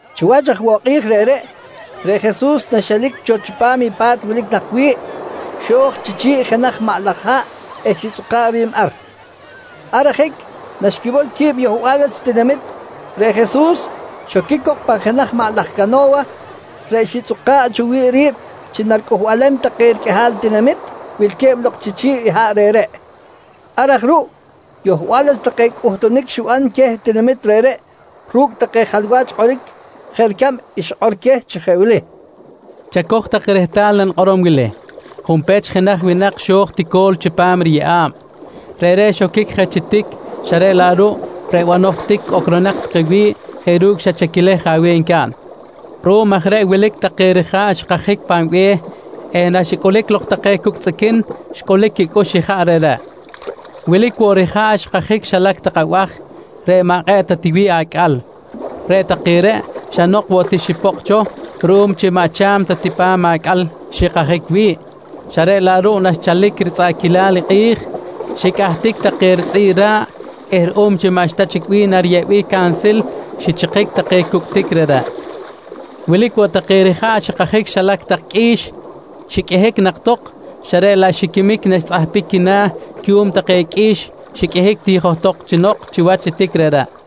Chiwach aj woꞌ kꞌi̱j reꞌreꞌ, reꞌ Jesus na xelic cho chipam i pa̱t wilic nak wi̱ꞌ, xo̱j chi chi̱ꞌ i jenaj maꞌ laj haꞌ eh xitzꞌuka̱ꞌ ri̱b ar. Ar ajic naxquimol qui̱b yohbal wach tinamit, reꞌ Jesus xoquic cok pan jenaj maꞌ laj cano̱wa reꞌ xitzꞌuka̱ꞌ cho wi̱ꞌ ri̱b chi naricꞌuhbalem take riqꞌuihal tinamit wilque̱b lok chi chi̱ꞌ i haꞌ reꞌreꞌ. Ar aj ruꞌ, yohbal wach take cꞌuhtunic xiban queh tinamit reꞌreꞌ ru̱cꞌ take jalwach kꞌoric jeꞌ ricab i xikꞌor queh chi jeꞌ wili: «Chacoj tak rehtal i nanikꞌorom wili: Junpech jenaj winak xo̱j tico̱l chipam riyeꞌa̱b. Reꞌreꞌ xoquic je chi tic xa reꞌ laꞌ ruꞌ reꞌ banoj tic ocronak take wi̱ꞌ jeꞌ ru̱cꞌ xa chaquilej je aweh ncaꞌn. Ruꞌum aj reꞌ wilic take rija̱ꞌ xikajic pan be̱h eh naxicꞌulic lok take cucꞌ tzꞌiquin xcꞌulic quicꞌux ijaꞌ reꞌreꞌ. Wilic woꞌ rija̱ꞌ xikajic xilac tak abaj reꞌ maꞌ kꞌe̱ꞌ ta wi̱ꞌ acꞌal. Reꞌ take reꞌ xa nok woꞌ ti xipokꞌ cho ruꞌum chi maꞌ cha̱m ta ti pa̱m acꞌal xikajic wi̱ꞌ, xa reꞌ laꞌ ruꞌ naxchalic ritzꞌaꞌquilal i kꞌi̱j, xicꞌahtic take ritzꞌi̱ꞌ ra̱ꞌ eh ruꞌum chi maꞌxta chic bih nariyeꞌbic cansil, xichikic take cucꞌ tic reꞌreꞌ. Wilic woꞌ take rija̱ꞌ xikajic xilac tak qꞌui̱x xiqꞌuihic nak tok, xa reꞌ laꞌ xiquimic naxtzꞌaparic quina̱ cuꞌum take qꞌui̱x xiqꞌuihic ti johtok chi nok chiwach i tic reꞌreꞌ.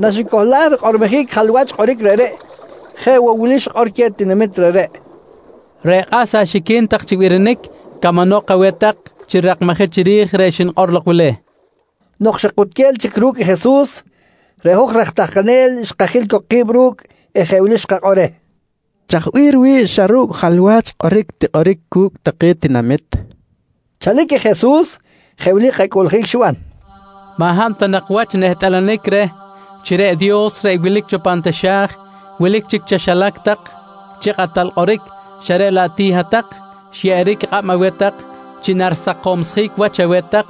Naxicohlaj rikꞌormojic i jalwach kꞌoric reꞌreꞌ, jeꞌ woꞌ wili xikꞌor queh tinamit reꞌreꞌ: «Reꞌ kꞌas axiquin tak chi birinic camanok aweh tak chi rirakmajic chiri̱j reꞌ xnikꞌor lok wili, nqui queh. Nok xa kutquel chic ru̱cꞌ Jesus, reꞌ hoj raj tahkanel xkajil cok ki̱b ru̱cꞌ eh jeꞌ wili xkakꞌor reh: «Chaj bih riwi̱ꞌ chi xa ru̱cꞌ jalwach kꞌoric tikꞌoric cu̱cꞌ take tinamit? kojqui reh. Chalic i Jesus, jeꞌ wili kacꞌuꞌljic xiban: «Maꞌ hab ta nak wach nehtꞌalanic reh chi reꞌ Dios reꞌ wilic cho pan taxa̱j, wilic chic chaxilac tak chi kꞌatal kꞌoric xa reꞌ laꞌ ti hat-tak xyeꞌeric kꞌab aweh tak chi narisakomjic wach aweh tak,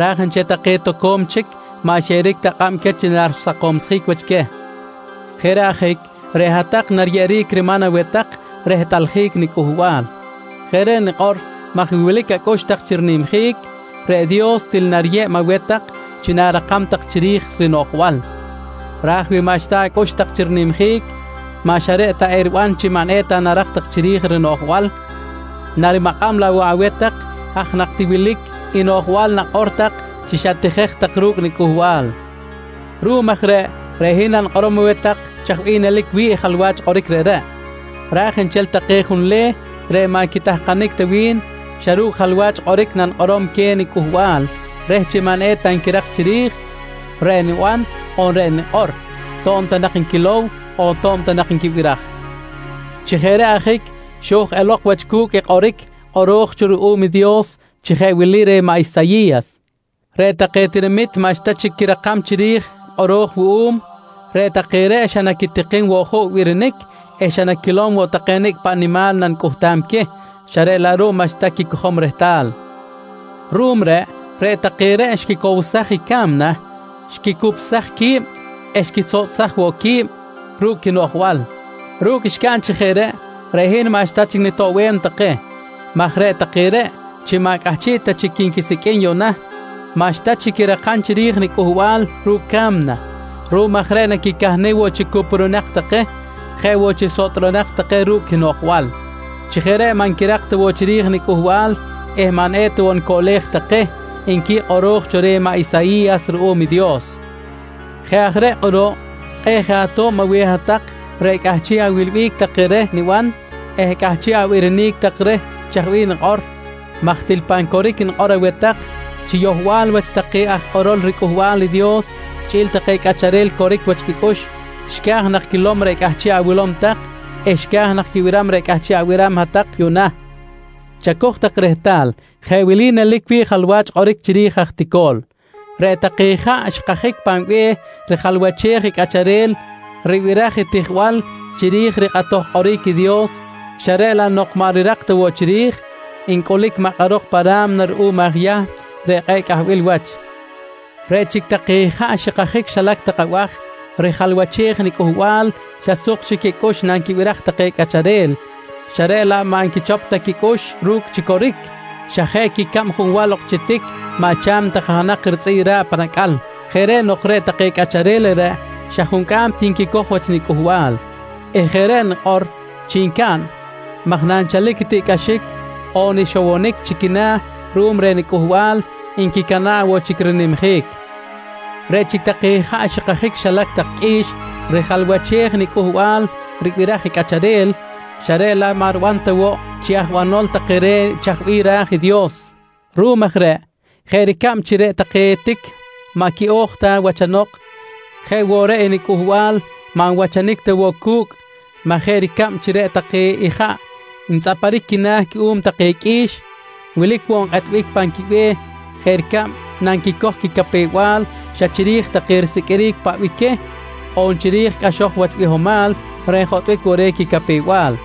raj nchel take toco̱m chic maꞌ xyeꞌeric ta kꞌab chi narisakomjic wach queh. Jeꞌ reꞌ ajic reꞌ hat-tak nariyeꞌeric riman aweh tak rehtꞌaljic niCꞌuhbal. Jeꞌ reꞌ nikꞌor maj wi wilic acꞌux tak chi rinimjic, reꞌ Dios til nariyeb aweh tak chi na̱rakam tak chiri̱j rinoꞌjbal. Raj wi maꞌxta acꞌux tak chi rinimjic, maꞌ xa reꞌ ta eriban chi maꞌ eta narak tak chiri̱j rinoꞌjbal, narimakꞌam laꞌ woꞌ aweh tak i haj nak ti wilic i noꞌjbal nakꞌor tak chi xatijej tak ru̱cꞌ nicꞌuhbal. Ruꞌum aj reꞌ, reꞌ hin nanikꞌorom aweh tak chaj bih nelic wi̱ꞌ i jalwach kꞌoric reꞌreꞌ, raj nchel take junleh reꞌ maꞌ quitahkanic ta wi̱n, xa ru̱cꞌ jalwach kꞌoric nanikꞌorom queh niCꞌuhbal reh chi maꞌ eta nquirak chiri̱j reꞌ niban on reꞌ nikꞌor, to̱b ta nak nquilow on to̱b ta nak nquibiraj. Chi jeꞌ reꞌ ajic xo̱j elok wach cu̱cꞌ i kꞌoric kꞌoro̱j cho ruꞌum i Dios chi jeꞌ wili reh maꞌ Isayi̱yas: “Reꞌ take nitinami̱t maꞌxta chic quirakam chiri̱j i kꞌoro̱j wuꞌum. Reꞌ take reꞌ xa naquitikim woꞌ juꞌ birinic eh xa naquilom woꞌ take nicꞌ paꞌ nimal nanicꞌuhtam queh, xa reꞌ laꞌ ruꞌ maꞌxta quicojom rehtal. Ruꞌum reꞌ, reꞌ take reꞌ xquicowsaj i ca̱mna, xquicupsaj qui̱b eh xquisotꞌsaj woꞌ qui̱b ru̱cꞌ quinoꞌjbal. Ru̱cꞌ xcaꞌn chi jeꞌ reꞌ, reꞌ hin maꞌxta chic nitoꞌbem take maj reꞌ take reꞌ chi maꞌ cꞌahchiꞌ ta chic quinquisicꞌ yuꞌna, maꞌxta chic quirakam chiri̱j i niCꞌuhbal ru̱cꞌ ca̱mna. Ruꞌum aj reꞌ naquicahnic woꞌ chi cuprunak take, jeꞌ woꞌ chi sotꞌronak take ru̱cꞌ quinoꞌjbal. Chi jeꞌ reꞌ maꞌ nquirak ta woꞌ chiri̱j i niCꞌuhbal eh maꞌ eta woꞌ nicoꞌlej take, nqui kꞌoro̱j cho reh maꞌ Isayi̱yas ruꞌum Dios. «Jeꞌ aj reꞌ kꞌuruꞌ, kꞌe̱ꞌ je ato̱b aweh hat-tak reꞌ cꞌahchiꞌ awilbic take reh niban eh cꞌahchiꞌ abirinic tak reh chaj bih nikꞌor maj til pan coric nikꞌor aweh tak chi yohbal wach take aj kꞌorol riCꞌuhbal i Dios chꞌi̱l take cꞌacharel coric wach quicꞌux xca̱j nak quilom reꞌ cꞌahchiꞌ awilow tak eh xca̱j nak quibiram reꞌ cꞌahchiꞌ abiram hat-tak yuꞌna. «Chacoj tak rehtal, jeꞌ wili nelic wi̱ꞌ i jalwach kꞌoric chiri̱j i aj tico̱l: Reꞌ take ijaꞌ xikajic pan be̱h rijalwachej i cꞌacharel ribiraj i tijbal chiri̱j rikꞌatoj kꞌoric i Dios xa reꞌ laꞌ nok maꞌ rirak ta woꞌ chiri̱j, ncꞌulic makꞌarok pa ra̱mna ruꞌum i aj Yahm reꞌ kꞌe̱ꞌ cꞌahbil wach. Reꞌ chic take ijaꞌ xikajic xilac tak abaj rijalwachej i niCꞌuhbal xa suk chic quicꞌux nanquibiraj take cꞌacharel, xa reꞌ laꞌ maꞌ nquichop ta quicꞌux ru̱cꞌ chi coric, xa jeꞌ quicab junwal ok chi tic maꞌ cha̱m ta kajanak ritzꞌi̱ꞌ ra̱ꞌ pan acꞌal. Jeꞌ reꞌ nok, reꞌ take cꞌacharel reꞌreꞌ xa juncꞌam ti nquicoj wach niCꞌuhbal eh jeꞌ reꞌ nikꞌor chi ncaꞌn maj nanchalic i tiꞌcꞌaxic on ixowonic china̱ ruꞌum reh nicꞌuhbal, ricana̱ꞌ woꞌ chic rinimjic. «Reꞌ chic take ijaꞌ xikajic xilac tak qꞌui̱x rijalwachej i niCꞌuhbal ribiraj i cꞌacharel, xa reꞌ laꞌ maꞌ riban ta woꞌ chi aj banol take reh chaj bih ra̱j i Dios. Ruꞌum aj reꞌ jeꞌ ricab chi reꞌ take tic maꞌ quiꞌo̱j ta wachanok, jeꞌ woꞌ reꞌ i niCꞌuhbal maꞌ nwachanic ta woꞌ cu̱cꞌ maj jeꞌ ricab chi reꞌ take ijaꞌ ntzꞌaparic quina̱ cuꞌum take qꞌui̱x, wilic woꞌ nkꞌetbic pan quibe̱h jeꞌ ricab nanquicoj quicapew-bal xa chiri̱j take risiqꞌuiric paꞌ bih queh on chiri̱j take cꞌaxoj wach bihomal reꞌ njotꞌbic woꞌ reh quicapew-bal.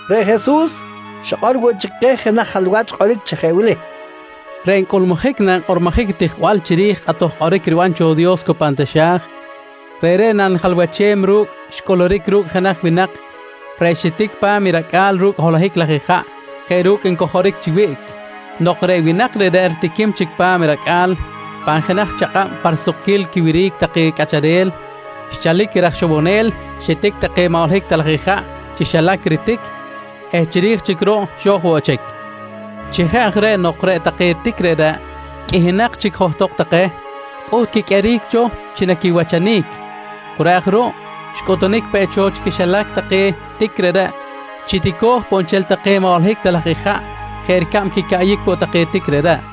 Reꞌ Jesus xikꞌor woꞌ chic keh jenaj jalwach kꞌoric chi jeꞌ wili: «Reꞌ ncꞌulmujic nankꞌormojic i tijbal chiri̱j i kꞌatoj kꞌoric riban cho Dios cu pan taxa̱j, reꞌreꞌ nanijalwachem ru̱cꞌ reꞌ xcꞌuluric ru̱cꞌ jenaj winak reꞌ xitic pa̱m i racꞌa̱l ru̱cꞌ holohic laj ijaꞌ jeꞌ ru̱cꞌ ncojoric chi wiꞌc. Nok reꞌ winak reꞌreꞌ ritiquim chic pa̱m i racꞌa̱l, pan jenaj chakꞌab pa risukquil quiwiric take cꞌacharel, xchalic i raj ixowonel xitic take maꞌ holohic ta laj ijaꞌ chi xilac i ritic eh chiri̱j chic ruꞌ xo̱j woꞌ chic. Chi jeꞌ aj reꞌ nok reꞌ take tic reꞌreꞌ qꞌuihinak chic johtok take, pꞌuht quiqꞌueric cho chi naquiwachanic. Cu reꞌ aj ruꞌ, xcꞌutunic peꞌ cho chi quixilac take tic reꞌreꞌ chi tico̱j poꞌ nchel take maꞌ holohic ta laj ijaꞌ jeꞌ ricab quicaꞌyic woꞌ take tic reꞌreꞌ.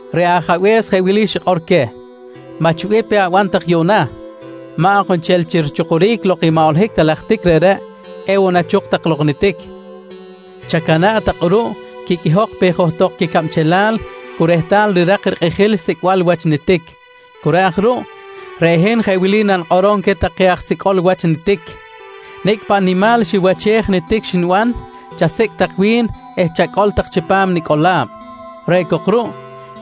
«Reꞌ ajabe̱s jeꞌ wili xikꞌor queh: ‹Maꞌ chi bih pe aban tak yuꞌna, maꞌ ok nchel chi richukuric lok i maꞌ holohic ta laj tic reꞌreꞌ ewoꞌ nachuk tak lok i nitic. Chacana̱ꞌ tak kꞌuruꞌ, quiqꞌuihok pe johtok quicabchelal cu rehtal rirak rikꞌijil sicꞌbal wach nitic. Cu reꞌ aj ruꞌ, reꞌ hin jeꞌ wili nanikꞌorom queh take aj sicꞌol wach nitic: Nicꞌ paꞌ nimal xiwachej nitic xniban, chasicꞌ tak wi̱n eh chacꞌol tak chipam nicꞌola̱b. Reꞌ cok ruꞌ,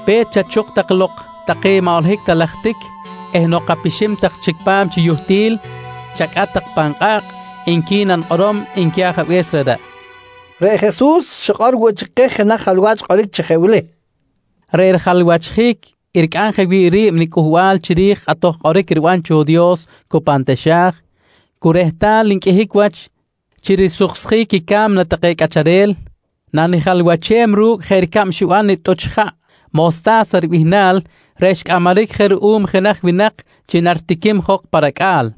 pe̱t chachuk tak lok take maꞌ holohic ta laj tic eh nok apixim tak chic pa̱m chi yuhtil, chacꞌat tak pan kꞌa̱kꞌ, nqui nanikꞌorom, nqui ajabe̱s reꞌreꞌ, nqui Jesus. Reꞌ Jesus xikꞌor woꞌ chic keh jenaj jalwach kꞌoric chi jeꞌ wili: «Reꞌ rijalwachjic i ricꞌam jeꞌ wi̱ꞌ ri̱b niCꞌuhbal chiri̱j i kꞌatoj kꞌoric riban cho i Dios cu pan taxa̱j, cu rehtal nqꞌuihic wach chi risuksjic i ca̱mna take cꞌacharel, nanijalwachem ru̱cꞌ jeꞌ ricab xiban i tꞌuch ijaꞌ mosta̱sa ribihnal reꞌ xcꞌamaric je ruꞌum jenaj winak chi naritiquim jok pa racꞌa̱l.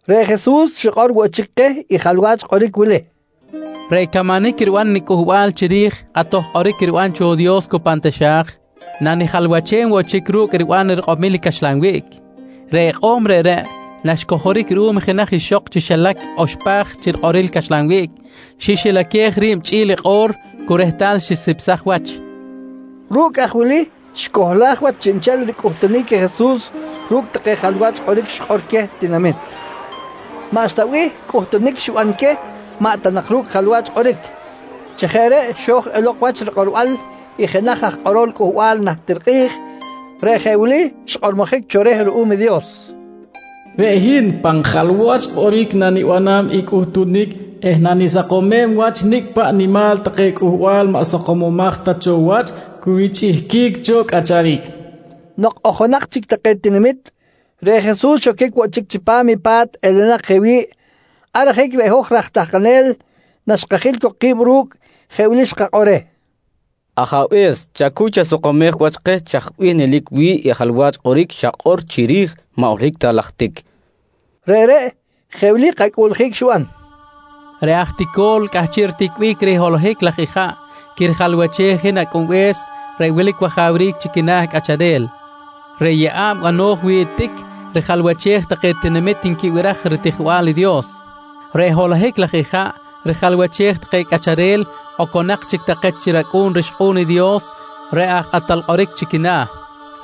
Reꞌ Jesus xikꞌor woꞌ chic keh i jalwach kꞌoric wili: «Reꞌ camanic riban i niCꞌuhbal chiri̱j kꞌatoj kꞌoric riban cho Dios cu pan taxa̱j, nanijalwachem woꞌ chic ru̱cꞌ riban i rikꞌomil caxlan wiꞌc. Reꞌ ikꞌo̱m reꞌreꞌ, naxcojoric ruꞌum i jenaj ixok chi xilac i oxpaj chi rikꞌoril caxlan wiꞌc, xixilaquej ri̱b chꞌi̱l i kꞌo̱r cu rehtal xisipsaj wach, nqui Jesus. Ru̱cꞌ aj wili xicohlaj wach chiꞌnchel ricꞌuhtunic i Jesus ru̱cꞌ take jalwach kꞌoric xikꞌor queh tinamit. Maꞌxta bih cꞌuhtunic xiban queh maꞌ ta nak ru̱cꞌ jalwach kꞌoric. Chi jeꞌ reꞌ xo̱j elok wach rikꞌorbal i jenaj aj kꞌorol cꞌuhbal najtir kꞌi̱j, reꞌ jeꞌ wili xkꞌormojic cho reh ruꞌum i Dios: “Reꞌ hin pan jalwach kꞌoric nanibanam i cꞌuhtunic eh nanisakomem wach nicꞌ paꞌ nimal take cꞌuhbal maꞌ sakomomaj ta cho wach cu richꞌihquic cho cꞌacharic, nqui kꞌoro̱j cho. Nok ojonak chic take tinamit, reꞌ Jesus xoquic woꞌ chic chipam i pa̱t elenak je wi̱ꞌ. Ar ajic reꞌ hoj raj tahkanel naxkajil cok ki̱b ru̱cꞌ, jeꞌ wili xkakꞌor reh: «Ajabe̱s, chacuy chasakomej wach keh chaj bih nelic wi̱ꞌ i jalwach kꞌoric xakꞌor chiri̱j maꞌ holohic ta laj tic, kojqui reh. Reꞌreꞌ, jeꞌ wili kacꞌuꞌljic xiban: «Reꞌ aj tico̱l cꞌahchiꞌ riticbic reh i holohic laj ijaꞌ quirijalwachej i hin Acꞌunbe̱s reꞌ wilic wajawric chi quina̱ cꞌacharel. Reꞌ yeꞌa̱b bano̱j wi̱ꞌ i tic rijalwachej take tinamit nquibiraj ritijbal i Dios. Reꞌ holohic laj ijaꞌ rijalwachej take cꞌacharel oconak chic take chi racꞌu̱n rixkꞌu̱n i Dios reꞌ aj kꞌatal kꞌoric chi quina̱.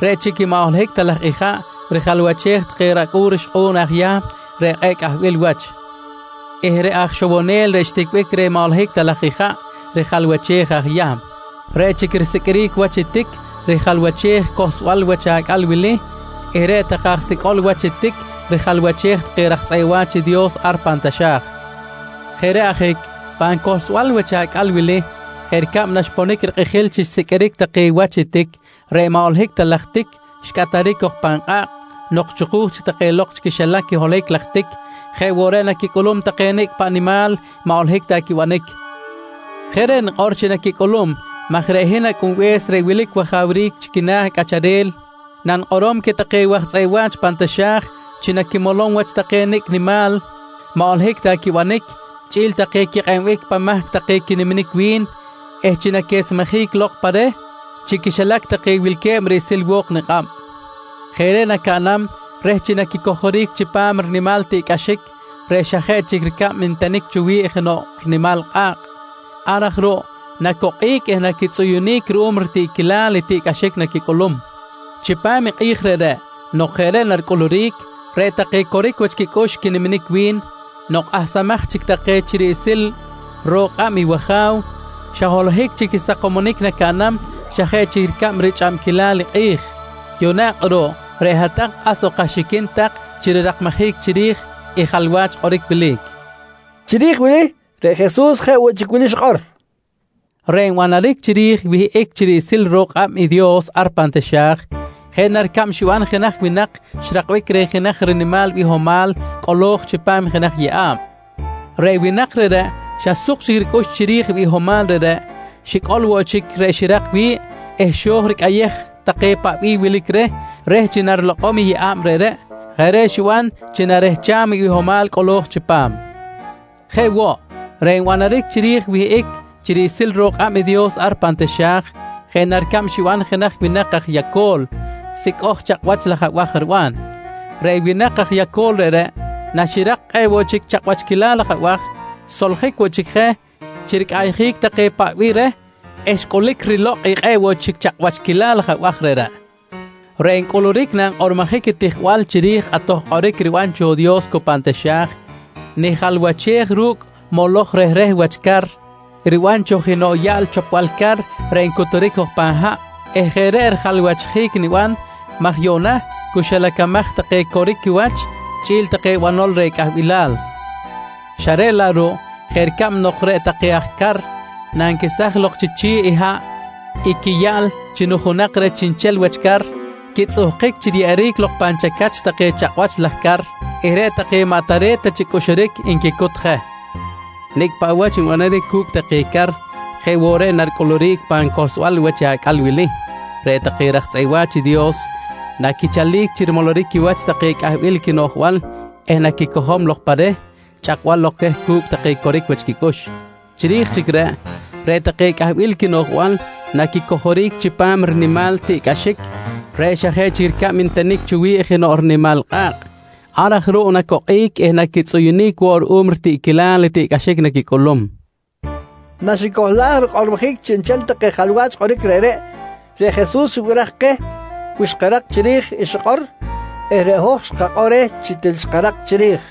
Reꞌ chic i maꞌ holohic ta laj ijaꞌ rijalwachej take racꞌu̱n rixkꞌu̱n i aj Yahm reꞌ kꞌe̱ꞌ cꞌahbil wach eh reꞌ aj ixowonel reꞌ xticbic reh maꞌ holohic ta laj ijaꞌ rijalwachej aj Yahm. Reꞌ chic risiqꞌuiric wach i tic rijalwachej i cohlsbal wach acꞌal wili eh reꞌ take aj sicꞌol wach tic rijalwachej take raj tzꞌeꞌ wa̱ch i Dios ar pan taxa̱j. Jeꞌ reꞌ ajic, pan cohlsbal wach acꞌal wili, jeꞌ ricab naxponic rikꞌijil chi xsiqꞌuiric take wach i tic, reꞌ maꞌ holohic ta laj tic xcꞌataric cok pan kꞌa̱kꞌ nok chuku̱j chic take lok chi quixilac i holohic laj tic, jeꞌ woꞌ reꞌ naquicꞌulum take nicꞌ paꞌ nimal maꞌ holohic ta quibanic. Jeꞌ reꞌ nikꞌor chi naquicꞌulum maj reꞌ hin Acꞌunbe̱s reꞌ wilic wajawric chi quina̱ cꞌacharel nanikꞌorom queh take waj tzꞌeꞌ wa̱ch pan taxa̱j chi naquimolom wach take nicꞌ nimal maꞌ holohic ta quibanic, chꞌi̱l take quikꞌeb-bic pan mahc take quiniminic wi̱n eh chi naquesmejic lok pa reh chi quixilac take wilque̱b riꞌsil wo̱k nikꞌab. Jeꞌ reꞌ nacaꞌnam reh chi naquicojoric chipam rinimal tiꞌcꞌaxic reꞌ xa jeꞌ chic ricab ntenic cho wi̱ꞌ jenoꞌ rinimal kꞌa̱kꞌ. Ar aj ruꞌ, nacokꞌic eh naquitzꞌuyunic ruꞌum ritiꞌquilal i tiꞌcꞌaxic naquicꞌulum. Chipam i kꞌi̱j reꞌreꞌ nok jeꞌ reꞌ naricꞌuluric, reꞌ take coric wach quicꞌux quiniminic wi̱n, nok kꞌahsamaj chic take chi riꞌsil ro̱k kꞌab i wAja̱w, xa holohic chic i sakomonic nacaꞌnam, xa jeꞌ chic ricab richꞌabquilal i kꞌi̱j. Yuꞌna kꞌuruꞌ reꞌ hat-tak kꞌas ok axiquin tak chi rirakmajic chiri̱j i jalwach kꞌoric wili, nqui keh. Chiri̱j wili reꞌ Jesus jeꞌ woꞌ chic wili xikꞌor: «Reꞌ nbanaric chiri̱j i wihꞌic chi riꞌsil ro̱k kꞌab i Dios ar pan taxa̱j, jeꞌ na ricab xiban jenaj winak xrakbic reh jenaj rinimal bihomal cꞌolo̱j chipam jenaj yeꞌa̱b. Reꞌ winak reꞌreꞌ, xa suk chic ricꞌux chiri̱j i bihomal reꞌreꞌ, xicꞌol woꞌ chic reꞌ xirak wi̱ꞌ eh xo̱j ricꞌayej take paꞌ bih wilic reh, reh chi narilokꞌom i yeꞌa̱b reꞌreꞌ. Jeꞌ reꞌ xiban chi narehcham i bihomal cꞌolo̱j chipam. «Jeꞌ woꞌ, reꞌ nbanaric chiri̱j i wihꞌic chi riꞌsil ro̱k kꞌab i Dios ar pan taxa̱j, jeꞌ na ricab xiban jenaj winak aj yaco̱l sicꞌoj chakꞌwach laj abaj riban. Reꞌ winak aj yaco̱l reꞌreꞌ, naxirak i kꞌe̱ꞌ woꞌ chic chakꞌwachquil laj abaj, xsoljic woꞌ chic je chi ricꞌayjic take paꞌ bih reh eh xcꞌulic rilokꞌ i kꞌe̱ꞌ woꞌ chic chakꞌwachquil laj abaj reꞌreꞌ. «Reꞌ ncꞌuluric nankꞌormojic i tijbal chiri̱j i kꞌatoj kꞌoric riban cho Dios cu pan taxa̱j, nijalwachej ru̱cꞌ moloj rehreh wach car riban cho jenoꞌ yaꞌl chopbal car reꞌ ncuturic jok pan haꞌ eh jeꞌ reꞌ rijalwachjic niban maj yuꞌna cu xilacamaj take coric quiwach chꞌi̱l take banol reh cꞌahbilal xa reꞌ laꞌ ruꞌ, jeꞌ ricab nok reꞌ take aj car nanquesaj lok chi chi̱ꞌ haꞌ i quiyaꞌl chi nujunak reh chiꞌnchel wach car, quitzꞌuhkic chi riyeꞌeric lok pan chacach take chakꞌwach laj car eh reꞌ take maꞌ tare̱t ta chi cꞌuxuric nquicut je. Nicꞌ paꞌ wach nbanaric cu̱cꞌ take car, jeꞌ woꞌ reꞌ naricꞌuluric pan cohlsbal wach i acꞌal wili, reꞌ take raj tzꞌeꞌ wa̱ch i Dios naquichalic chi rimoloric quiwach take cꞌahbil quinoꞌjbal eh naquicojom lok pa reh cu̱cꞌ chꞌakbal queh cu̱cꞌ take coric wach quicꞌux. Chiri̱j chic reꞌ, reꞌ take cꞌahbil quinoꞌjbal naquicojoric chipam rinimal tiꞌcꞌaxic reꞌ xa jeꞌ chic ricab ntenic cho wi̱ꞌ jenoꞌ rinimal kꞌa̱kꞌ. Ar aj ruꞌ nacokꞌic eh naquitzꞌuyunic woꞌ ruꞌum ritiꞌquilal tiꞌcꞌaxic naquicꞌulum, nqui Jesus keh. Naxicohlaj rikꞌormojic chiꞌnchel take jalwach kꞌoric reꞌreꞌ, reꞌ Jesus xibiraj keh wi xkarak chiri̱j i xikꞌor eh reꞌ hoj xkakꞌor reh chi til xkarak chiri̱j.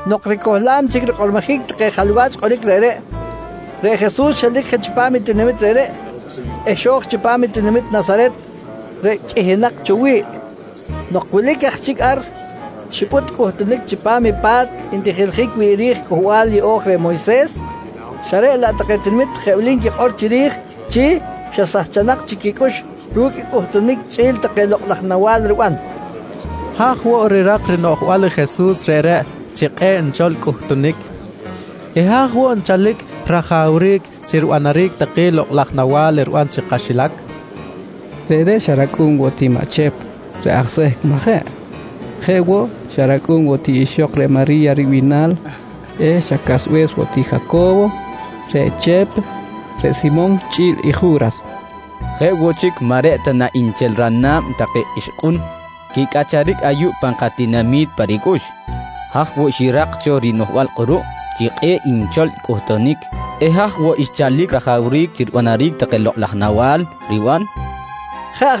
Nok ricohlam chic rikꞌormojic take jalwach kꞌoric reꞌreꞌ, reꞌ Jesus xelic je chipam i tinamit reꞌreꞌ eh xo̱j chipam i tinamit Nasaret reꞌ qꞌuihinak cho wi̱ꞌ. Nok wilic aj chic ar, xipꞌut cꞌuhtunic chipam i pa̱t ntijiljic wi̱ꞌ ri̱j Cꞌuhbal Yeꞌo̱j reh Moyses, xa reꞌ laꞌ take tinamit jeꞌ wili nquikꞌor chiri̱j chi xa sahchanak chic quicꞌux ru̱cꞌ i cꞌuhtunic chꞌi̱l take lokꞌ laj nawa̱l riban: «Haj woꞌ rirak i rinoꞌjbal i Jesus reꞌreꞌ chi kꞌe̱ꞌ nchol cꞌuhtunic? Eh haj woꞌ nchalic rajawric chi ribanaric take lokꞌ laj nawa̱l riban chi kaxilac? Reꞌreꞌ xa racꞌu̱n woꞌ ti maꞌ Chep reꞌ aj sehc, majeꞌ? Jeꞌ woꞌ, xa racꞌu̱n woꞌ ti ixok reꞌ Mari̱ya ribihnal eh xa casbe̱s woꞌ ti Jaco̱wo, reꞌ Chep, reꞌ Simon chꞌi̱l i Ju̱ras. Jeꞌ woꞌ chic maꞌ reꞌ ta na nchel rana̱b take ixkꞌun quicꞌacharic ayuꞌ pan katinami̱t pa ricꞌux? Haj woꞌ xirak cho rinoꞌjbal kꞌuruꞌ chi kꞌe̱ꞌ nchol cꞌuhtunic eh haj woꞌ xchalic rajawric chi ribanaric take lokꞌ laj nawa̱l riban? nqui take.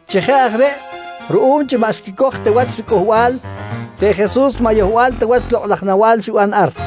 Chi jeꞌ aj reꞌ ruꞌum chi maꞌ xquicoj ta wach riCꞌuhbal, reꞌ Jesus maꞌ yohbal ta wach lokꞌ laj nawa̱l xiban ar.